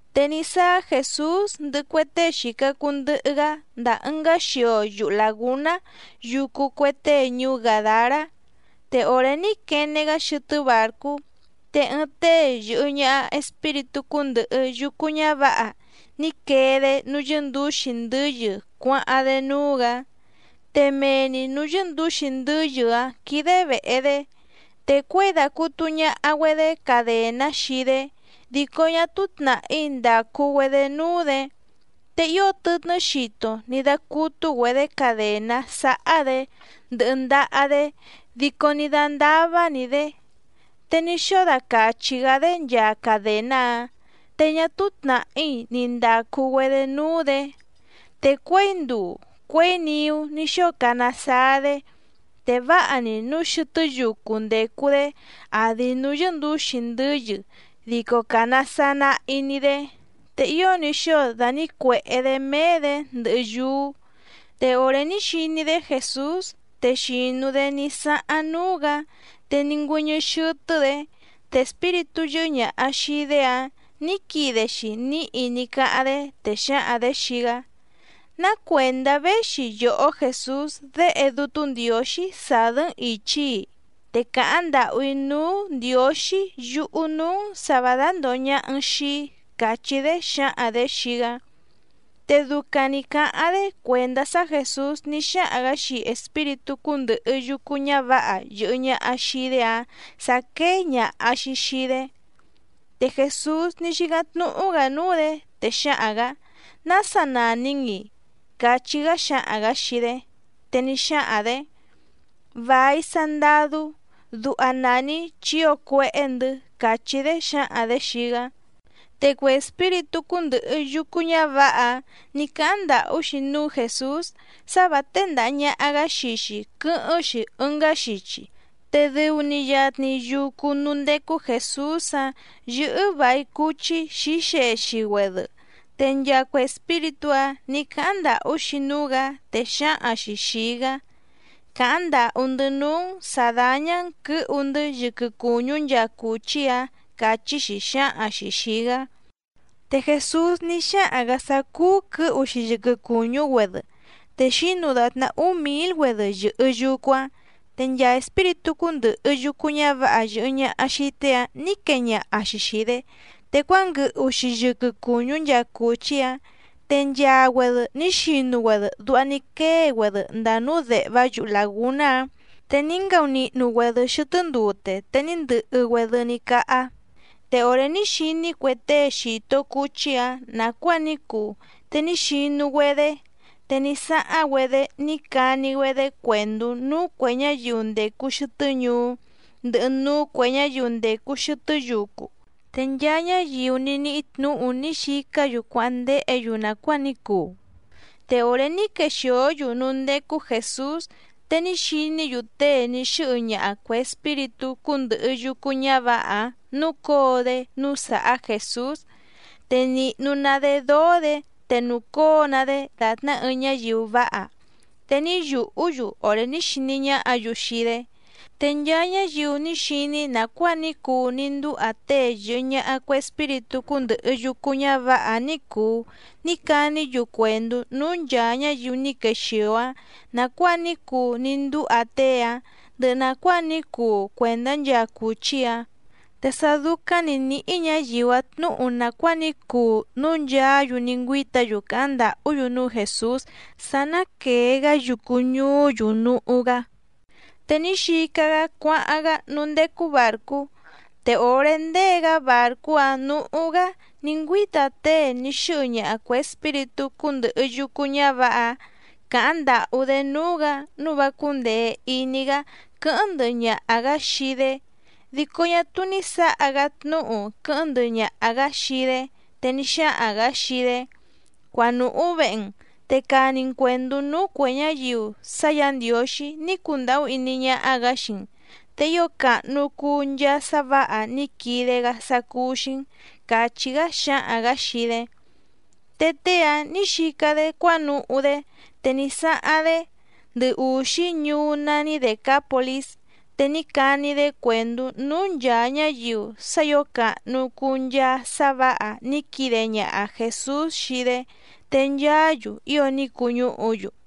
Te ní sáá Jèsús ndɨhɨ cue tée xìca cuu ndɨhɨ‑gá ndàa ɨngá xio yuhu làgúná yucu cue tée ñuú Gàdará. Te òré ní quene‑gá xɨtɨ́ bàrcú te ɨɨⁿ tée yɨ̀hɨ ñaha espíritú cúndɨ̀hɨ yucu ñávǎha ní quee‑dé núú yɨ́ndǔxi ndɨ́yɨ cuáháⁿ‑dé núú‑gǎ. Te mee‑ni nǔú yɨ́ndǔxi ndɨ́yɨ‑áⁿ quídé vèhe‑dé, te cuěi dàcutu ñaha‑güedé cadèná xii‑dé dico ñá túú tnàhí ndàcu‑güedé núú‑dě. Te ío tɨtnɨ́ xito ní dácútú‑güedě cadèná sáhá‑dě ndɨhɨ ndaha‑dé dico ní dándává‑ni‑dě, te ní xóo dacàchi‑gá‑dé nchaa cadèná‑áⁿ, te ñá túú tnàhí ni ndàcu‑güedé núú‑dě. Te cuěi nduu cuěi niú ní xóo cana saa‑dé, te váha‑ni núu xɨtɨ́ yucu ndècu‑dé àdi núú yɨ́ndǔxi ndɨ́yɨ dico càna saa nahi‑ni‑dé, te ío ní xóo dànícuèhé‑dé méé‑dě ndɨhɨ yúú. Te òré ní xiní‑dé Jèsús te xìnu‑dé ní sáháⁿ núú‑gǎ, te ní ngüɨ́ñɨ́ xɨ́tɨ́‑dě, te espíritú yɨ́hɨ́ ñàha xii‑dé‑áⁿ nǐ quide‑xi níhi ní cáháⁿ‑dé, te xǎhaⁿ‑dě xii‑gá: —¿Ná cuèndá véxi yòhó Jèsús Déhe Dútú Ndiǒxí sàdɨ́‑n ìchi‑í? Te càháⁿ ndàhú‑í núú Ndiǒxí yuhu nǔú‑n sǎ vǎ dándòho ñaha‑n xii‑í —càchí‑dé xǎhaⁿ‑dě xii‑gá. Te ducaⁿ nǐ cáháⁿ‑dé cuèndá sá Jèsús ní xáhaⁿ‑gǎ xii espíritú cúndɨ̀hɨ yucu ñávǎha yɨ̀hɨ ñaha xii‑dé‑áⁿ sǎ quéé ñàha‑xi xii‑dé. Te Jèsús ní xícáⁿ tnúhú‑gǎ núú‑dě, te xǎhaⁿ‑gǎ: —¿Nása nàni‑n‑i? —cachí‑gá xǎhaⁿ‑gǎ xii‑dé. Te ní xáhaⁿ‑dě: —Vài Sandadú, duha nàni‑í chi ío cuéhé‑ndɨ̌ —càchí‑dé xǎhaⁿ‑dě xii‑gá. Te cue espíritú cúndɨ̀hɨ yucu ñávǎha‑áⁿ nǐ cáháⁿ ndàhú‑xi núú Jèsús sá vǎ téndàha ñaha‑gá xii‑xi quɨ́hɨ́ⁿ‑xi ɨngá xichi. Te dɨu‑ni yatni yucu núú ndécú Jèsús‑áⁿ yɨ́hɨ́ vài cuchí xǐxexi‑güedɨ. Te nchaa cue espíritú‑áⁿ nǐ cáháⁿ ndàhú‑xi núú‑gǎ, te xǎhaⁿ‑xi xìi‑gá: —Càháⁿ ndàhú‑ndɨ́ núú‑n sǎ dáñá‑n quɨ̌hu‑ndɨ́ yɨquɨ cùñú nchaa cùchí‑ǎⁿ —càchí‑xi xǎhaⁿ‑xi xìi‑gá. Te Jèsús ní xáhaⁿ‑gǎ sá cúú quɨ̌hu‑xi yɨquɨ cùñú‑güedɨ, te xǐnu dàtná úú mǐl‑güedɨ yɨ̀hɨ yucu‑áⁿ. Te nchaa espíritú cúndɨ̀hɨ yucu ñávǎha yɨ̀hɨ ñaha xii tée‑áⁿ nǐ quee ñaha‑xi xìi‑dé, te cuánguɨhu‑xi yɨquɨ cùñú nchaa cùchí‑áⁿ, te nchaa‑güedɨ ní xinu‑güedɨ duha ní quée‑güedɨ ndàa núú dèhvá yuhu làgúná‑áⁿ, te ní ngaunihnu‑güedɨ xɨtɨ́ ndute te ní ndɨhɨ‑güedɨ ní cáhá. Te òré ní xiní cue tée xìto cuchí‑áⁿ nàcuáa ní cuu te ní xinu‑güedé, te ní sáháⁿ‑güedé ní cani‑güedé cuèndú núú cuè ñáyiu ndècu xɨtɨ́ ñuú, ndɨhɨ núú cuè ñáyiu ndècu xɨtɨ́ yucu. Te nchaa ñáyiu ní níhí tnǔhu ní xicá‑yu cuáháⁿ ndéhě‑yu nàcuáa ní cuu. Te òré ní quexìó‑yu núú ndécú Jèsús te ní xiní‑yu tée ní xɨ́hɨ ñaha cuè espíritú cúndɨ̀hɨ yucu ñávǎha‑áⁿ núcǒo‑dé núú sàhá Jèsús, te nìhnu‑ná‑dé dóó‑dě te nùcóo‑ná‑dé dàtná ɨɨⁿ ñáyiu váha, te ní yùhú‑yu òré ní xiní ñáhǎ‑yu xii‑dé. Te nchaa ñáyiu ní xiní nàcuáa ní cuu ní ndúha tée yɨ̀hɨ ñaha cue espíritú cúndɨ̀hɨ yucu ñávǎha‑áⁿ ní cùu ní caní‑yu cuèndú núú nchàa ñáyiu ní quexìo‑áⁿ nàcuáa ní cuu ní ndúha tée‑áⁿ ndɨhɨ nàcuáa ní cuu cuèndá nchaa cùchí‑áⁿ. Te sá dúcáⁿ ni nǐhí ñǎyiu‑áⁿ tnǔhu nàcuáa ní cuu núu nchaá‑yu ní ngüíta‑yu càháⁿ ndàhú‑yu núú Jèsús sá ná quèe‑gá yucu ñuú‑yu núhú‑gá. Te ní xica‑gá cuáháⁿ‑gá núú ndécú bàrcú, te òré ndée‑gá bàrcú‑áⁿ nǔhú‑gá ní ngüíta tée ní xɨ́hɨ ñaha cuè espíritú cúndɨ̀hɨ yucu ñávǎha‑áⁿ càháⁿ ndàhú‑dé núú‑gǎ nǔu vá cúndèe iní‑gá quɨ́hɨ́ⁿ ndɨhɨ ñaha‑gǎ xii‑dé. Dico ñá túú ní sǎha‑gá tnúhu quɨ́hɨ́ⁿ ndɨhɨ ñaha‑gǎ xii‑dé, te ní xáhaⁿ‑gǎ xii‑dé: —Cuanùhú vehe‑n, te cani‑n cuèndú núú cuè ñáyiu sá Yǎ Ndiǒxí ní cundàhú iní ñáhá‑gǎ xii‑n, te ío càhnu cuu nchaa sá vǎha ní quide‑gá sá cúú‑xí‑n —càchí‑gá xǎhaⁿ‑gǎ xii‑dé. Te tée‑áⁿ nǐ xica‑dé cuánuhú‑dé, te ní sáháⁿ‑dé ndɨ ùxí ñuú nání Dècápolís, te ní cani‑dé cuèndú núú nchàa ñáyiu sá ǐo càhnu cuu nchaa sá vǎha ní quide ñaha Jèsús xii‑dé, te nchaá‑yu ío ní cuñúhu‑yu.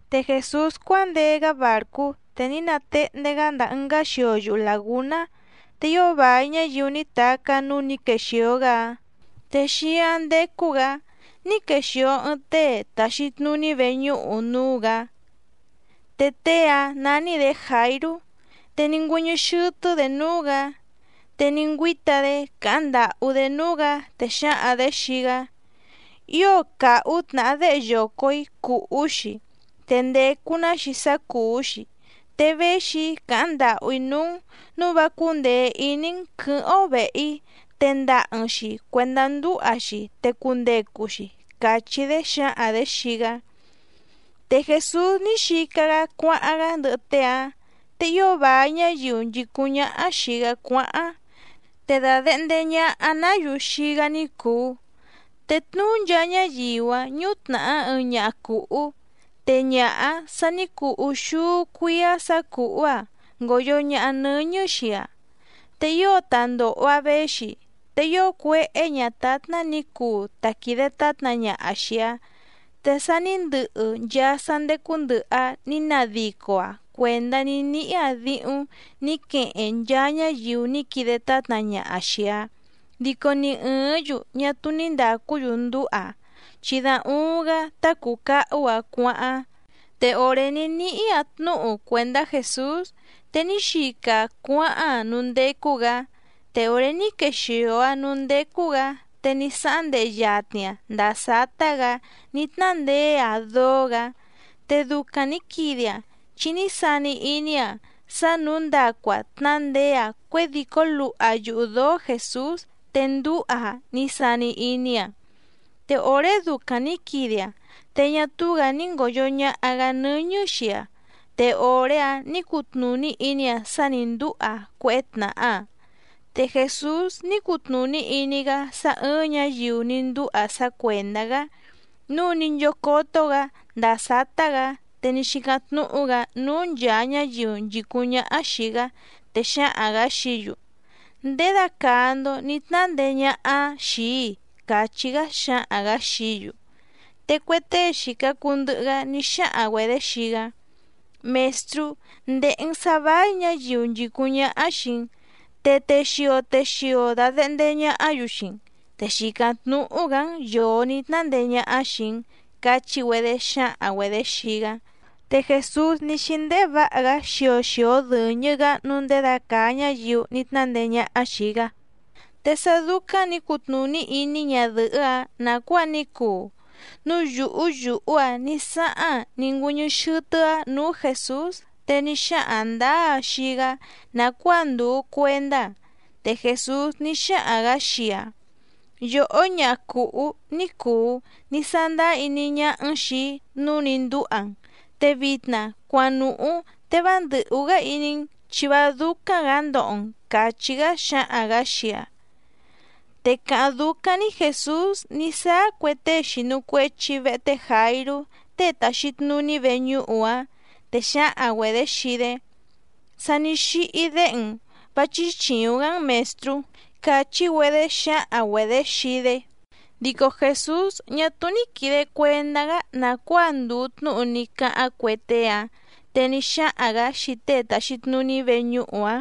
Te Jèsús cuándee‑gá bàrcú, te ní natehndé‑gá ndàa ɨngá xio yuhu làgúná, te ío vài ñáyiu ní tacá núú nǐ quexìo‑gá‑áⁿ, te xíáⁿ ndécú‑gǎ ní quexìo ɨɨⁿ tée tàxi tnuní veñúhu núú‑gǎ, te tée‑áⁿ nání‑dě Jàirú, te ní ngüɨ́ñɨ́ xɨ́tɨ́‑dě núú‑gǎ. Te ní ngüíta‑dé càháⁿ ndàhú‑dé núú‑gǎ, te xǎhaⁿ‑dě xii‑gá: —Ío càhú tnàhá déhe yoco‑ǐ cùhú‑xi, te ndècu‑ná‑xi sá cùú‑xi, te véxi‑í càháⁿ ndàhú‑í núú‑n nǔu vá cúndèe iní‑n quɨ̌hɨ́ⁿ‑ó vèhe‑í tendaha‑n‑xi cuèndá ndúha‑xi, te cundecu‑xi —càchí‑dé xǎhaⁿ‑dě xii‑gá. Te Jèsús ní xica‑gá cuáháⁿ‑gá ndɨhɨ tée‑áⁿ, te ío vài ñáyiu nchìcúⁿ ñáhá xìi‑gá cuáháⁿ, te dàdehnde ñaha‑ná‑yu xii‑gá ni cùu. Te tnuú nchaa ñáyiu‑áⁿ ñútnàhá ɨɨⁿ ñaha cùhú, te ñaha‑áⁿ sa ní cuu úxúú cuíá sǎ cùhú‑aⁿ ngòyo ñaha nɨ́ñɨ́ xii‑aⁿ. Te ío ta ndòho‑aⁿ véxi, te ío cuéhé ñǎtátná nǐ cuu ta quìde tátna ñaha xìi‑aⁿ, te sa ní ndɨhɨ nchaa sá ndécú ndɨ̀hɨ‑aⁿ ní nadico‑aⁿ cuèndá ní níhí‑aⁿ díhúⁿ nǐ queheⁿ nchaa ñáyiu ní quide tátna ñaha xìi‑aⁿ dico ni ɨ̀ɨ́ⁿ‑yu ñá túú ní ndàcú‑yu ndúha‑aⁿ, chi da uuⁿ‑gá tá cùu cahú‑aⁿ cuáháⁿ. Te òré ní níhí‑aⁿ tnúhu cuèndá Jèsús, te ní xica‑aⁿ cuáháⁿ‑aⁿ núú ndécú‑gǎ. Te òré ní quexìo‑aⁿ núú ndécú‑gǎ te ní sáháⁿ ndehe yatni‑aⁿ ndàa sátá‑gǎ ní tnándeé‑aⁿ dóó‑gǎ. Te ducaⁿ nǐ quide‑aⁿ chi ní sani iní‑aⁿ sá nǔu ndacu‑aⁿ tnándeé‑aⁿ cuědìcó luha yuhu dǒó Jèsús te ndúha‑aⁿ ní sani iní‑aⁿ. Te òré ducaⁿ nǐ quide‑aⁿ te ñá túú‑gǎ ní ngòyo ñaha‑gá nɨ́ñɨ́ xii‑aⁿ, te òré‑áⁿ nǐ cutnùní iní‑aⁿ sá nǐ ndúha‑aⁿ cuéhé tnàhá‑aⁿ. Te Jèsús ní cutnùní iní‑gá sá ɨ̀ɨⁿ ñáyiu ní ndúha sá cuèndá‑gá, núu ní nchócótó‑gǎ ndàa sátá‑gǎ te ní xícáⁿ tnúhú‑gǎ núú nchàa ñáyiu nchìcúⁿ ñáhá xìi‑gá, te xǎhaⁿ‑gǎ xií‑yu: —¿Ndědacàa‑ndo ní tnándeé ñáhá xìi‑í? —càchí‑gá xǎhaⁿ‑gǎ xií‑yu. Te cue tée xìca cuu ndɨhɨ‑gá ní xáhaⁿ‑güedě xii‑gá: —Mèstrú, ndèhe‑n sá váí ñǎyiu nchìcúⁿ ñáhá xìi‑n, te texio texio dàdehnde ñahá‑yu xii‑n te xìcáⁿ tnúhú‑gǎ‑n yòo ní tnándeé ñáhá xìi‑n —cachí‑güedé xǎhaⁿ‑güedě xii‑gá. Te Jèsús ní xíndéhé vǎha‑gá xio xio dɨ̀ñɨ‑gá nǔu ndědacàa ñáyiu ní tnándeé ñáhá xìi‑gá. Te sá dúcáⁿ nǐ cutnùní iní ñadɨ̀hɨ́‑áⁿ nàcuáa ní cuu, núu yùhú yùhú‑aⁿ ní sáháⁿ‑aⁿ ní ngüɨ́ñɨ́ xɨ́tɨ́‑áⁿ nǔú Jèsús, te ní xáhaⁿ ndǎá‑aⁿ xii‑gá nàcuáa ndùu cuendá‑aⁿ. Te Jèsús ní xáhaⁿ‑gǎ xii‑aⁿ: —Yòhó ñaha cùhú ní cùu, ní sándáá iní ñáhá‑n xìi‑í, núu ní ndúha‑n, te vitna cuanùhú te vá ndɨ̀hú‑gá iní‑n, chi vá dúcáⁿ‑gǎ ndoho‑n —càchí‑gá xǎhaⁿ‑gǎ xii‑aⁿ. Te càháⁿ dúcáⁿ‑ní Jèsús ní sáá cue tée xìnu cuechi vehe té Jàirú tée tàxi tnuní veñúhu‑áⁿ, te xǎhaⁿ‑güedě xii‑dé: —Sa ní xíhí déhe‑n, vá chíchìuⁿ‑gá‑n Mèstrú —càchí‑güedé xǎhaⁿ‑güedě xii‑dé. Dico Jèsús ñá túú ní quìde cuendá‑gá nàcuáa ndùu tnúhu ní cáháⁿ cue tée‑áⁿ, te ní xáhaⁿ‑gǎ xii tée tàxi tnuní veñúhu‑áⁿ: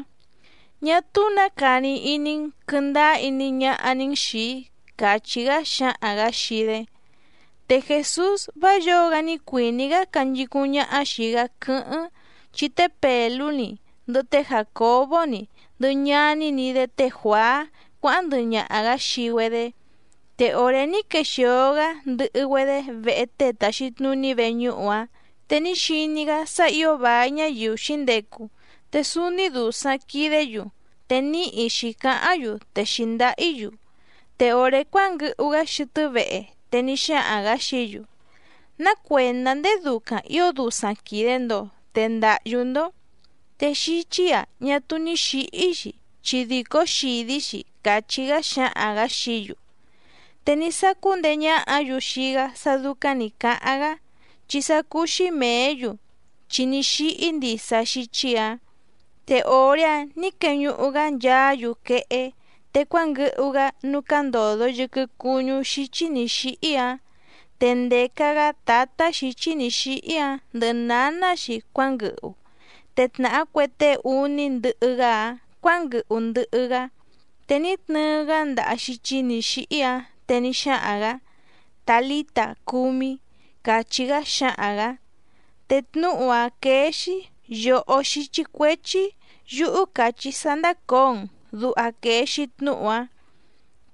—Ñá túú nǎ cani iní‑n, quɨndáá iní ñáhá‑ní‑n xìi‑í —càchí‑gá xǎhaⁿ‑gǎ xii‑dé. Te Jèsús vá yǒo‑gá ní cuìní‑gá canchicúⁿ ñáhá xìi‑gá quɨ́hɨ́ⁿ, chi té Pèlú‑ni, ndɨhɨ té Jàcobó‑ni, ndɨhɨ ñaní‑ni‑dé té Juàá cuáháⁿ ndɨhɨ ñaha‑gǎ xii‑güedé. Te òré ní quexìo‑gá ndɨhɨ‑güedé vehe tée tàxi tnuní veñúhu‑áⁿ, te ní xiní‑gá sá ǐo vài ñáyiu xǐndecu, te súúní dùsaⁿ quidé‑yu te níhi xǐcáháⁿ‑yu te xǐndáhí‑yu. Te òré cuánguɨhu‑gá xɨtɨ́ vehe, te ní xáhaⁿ‑gǎ xií‑yu: —¿Ná cuèndá ndéé dúcáⁿ ǐo dusaⁿ quìde‑ndo, te ndàhyú‑ndó? Te xíchí‑a ñá túú ní xǐhí‑xi chi dìcó xìdí‑xi —càchí‑gá xǎhaⁿ‑gǎ xií‑yu. Te ní sácú ndeé ñáhǎ‑yu xii‑gá sá dúcáⁿ nǐ cáháⁿ‑gá, chi sá cúú‑xí mèé‑yu chi ní xíhí ndisa xíchí‑ǎⁿ. Te òré‑áⁿ nǐ queñuhu‑gá nchaá‑yu quehé, te cuánguɨhu‑gá núú cándòdo yɨquɨ cuñú xíchí nǐ xíhí‑áⁿ. Te ndèca‑gá tǎtá xǐchí nǐ xíhí‑áⁿ ndɨhɨ nǎná‑xi cuánguɨhu, te tnàhá cue tée úní ndɨhɨ‑gá‑áⁿ cuǎnguɨhu ndɨhɨ‑gá. Te ní tnɨɨ‑gá ndaha xíchí nǐ xíhí‑áⁿ, te ní xáhaⁿ‑gǎ: —Tàlíta, cúmí —càchí‑gá xǎhaⁿ‑gǎ. Te tnúhu‑áⁿ quéé‑xí: Yòhó xíchí cuéchí yúhú càchí‑í sá ndácǒo‑n, duha quèe‑xi tnúhu‑áⁿ.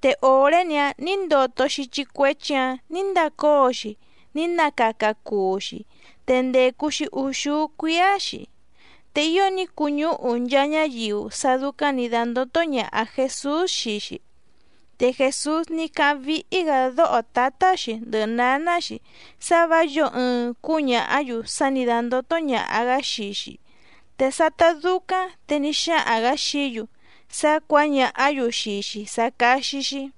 Te òré‑ni‑áⁿ nǐ ndoto xíchí cuéchí‑ǎⁿ nǐ ndacóo‑xi ní nacaca cuu‑xi, te ndècu‑xi úxúú cuíá‑xi. Te ío ní cuñúhu nchaa ñáyiu sá dúcáⁿ nǐ dándótó ñàha Jesús xii‑xi. Te Jèsús ní cáháⁿ víhí‑gǎ dóho tǎtá‑xi ndɨhɨ nǎná‑xi sá vǎ yǒo ɨɨⁿ cúñàhá‑yu sá nǐ dándótó ñàha‑gá xii‑xi. Te sátá dúcáⁿ te ní xáhaⁿ‑gǎ xií‑yu sá cuǎñàhá‑yu xii‑xi sá cáxí‑xí.